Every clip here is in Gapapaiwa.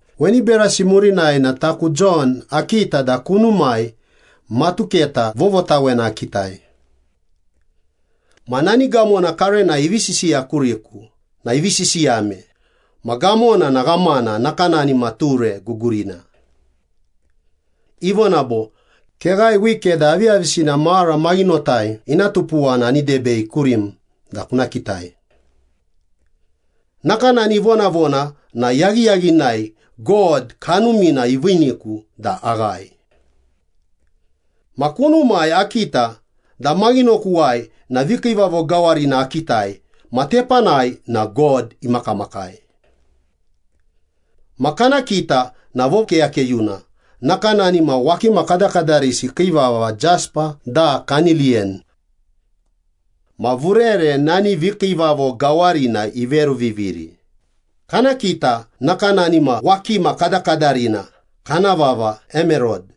Weni berasi murinai na taku Jon akita da kunumai matuketa vovotawena akitai. Ma nani gamona karenai ivi sisiya kuriku na ivi sisiyame, ma gamona na ghamana nakanani ma ture gugurina. Ivona bo, “Keghae wike da aviyavisina mara maghinotai ina tupuwa na ani debei kurim da kuna kitai.” Nakanani ivonavona na yaghiyaghinai God Kanumina iviiniku da aghae. Ma kunumai akita da maghinokuwai na vikiivavo gawarina akitai ma tepanai na God imakamakai. Ma kana kita na vokeyakeyuna nakanani ma wakima kadakadarisi kii vava jespa da kaniliyan. Ma vurere nani vikiivavo gawarina iveruviviri, kana kita nakanani ma wakima kadakadarina kana vava emerod.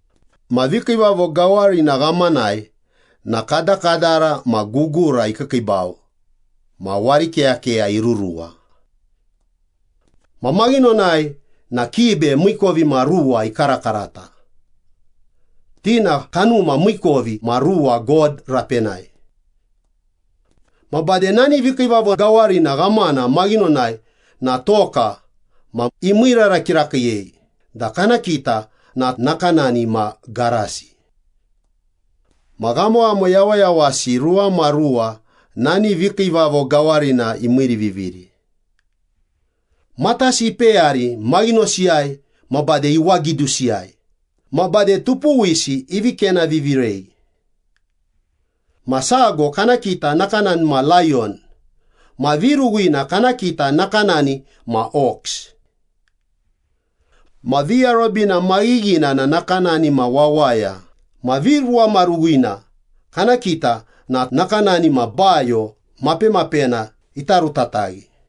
Ma vikiivavo gawarina ghamanai na kadakadara ma gugura ikiikiibau ma warikeyakeya iruruwa. Ma maghinonai na kibe miikovimaruwa ikarakarata, ti na kanuma miikovimaruwa God rapenai. Ma bade nani vikiivavo gawarina ghamana maghinonai na toka, ma imiirara kirakiiyei da kana kita na nakanani ma garasi. Ma ghamoghamo yawayawasi ruwamaruwa nani vikiivavo gawarina imiiriviviri. Matasi ipeyari maghinosiyai ma bade iwagidusiyai ma bade tupuwisi ivi kenavivirei. Ma sago kana kita na nakanani ma layon ma viruwina kana kita na nakanani ma ox. Ma viarobina maghighina na nakanani ma wawaya ma viruwamaruwina kana kita na nakanani ma bayo mapemapena ita rutataghi.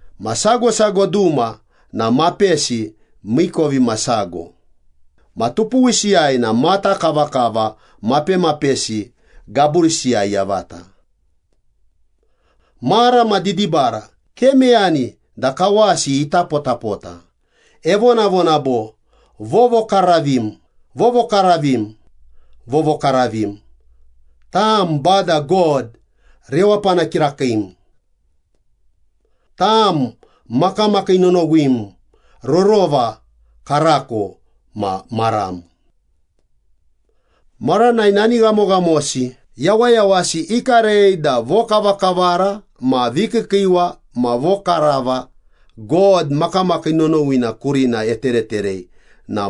Ma sago sago duma na mapesi miikovimasago ma tupuwisiyai na mata kavakava, mapemapesi gaburisiyai yavata. Mara ma didibara, ke meyani da kawasi ita potapota, evonavona bo, “Vovokaravim, vovokaravim, vovokaravim, tam Bada God rewapana kirakiim. Tam makamakii nonowim, rorova, karako ma maram.” Maranai nani ghamoghamosi yawayawasi ikarei da vokavakavara ma vikiikiiwa ma vokarava God makamakii nonowina kurina etereterei na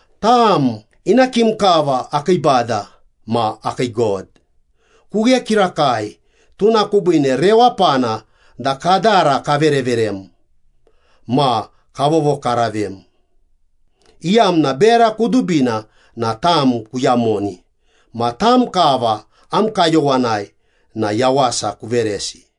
“Tam ina kim kava akii Bada ma akii God. Kughe kirakai, tuna kubiine rewapana da kadara kavereverem, ma kavovokaravem, Iyamna bera kudubina na tam kuyamoni ma tam kava am kayowanai na yawasa kuveresi.”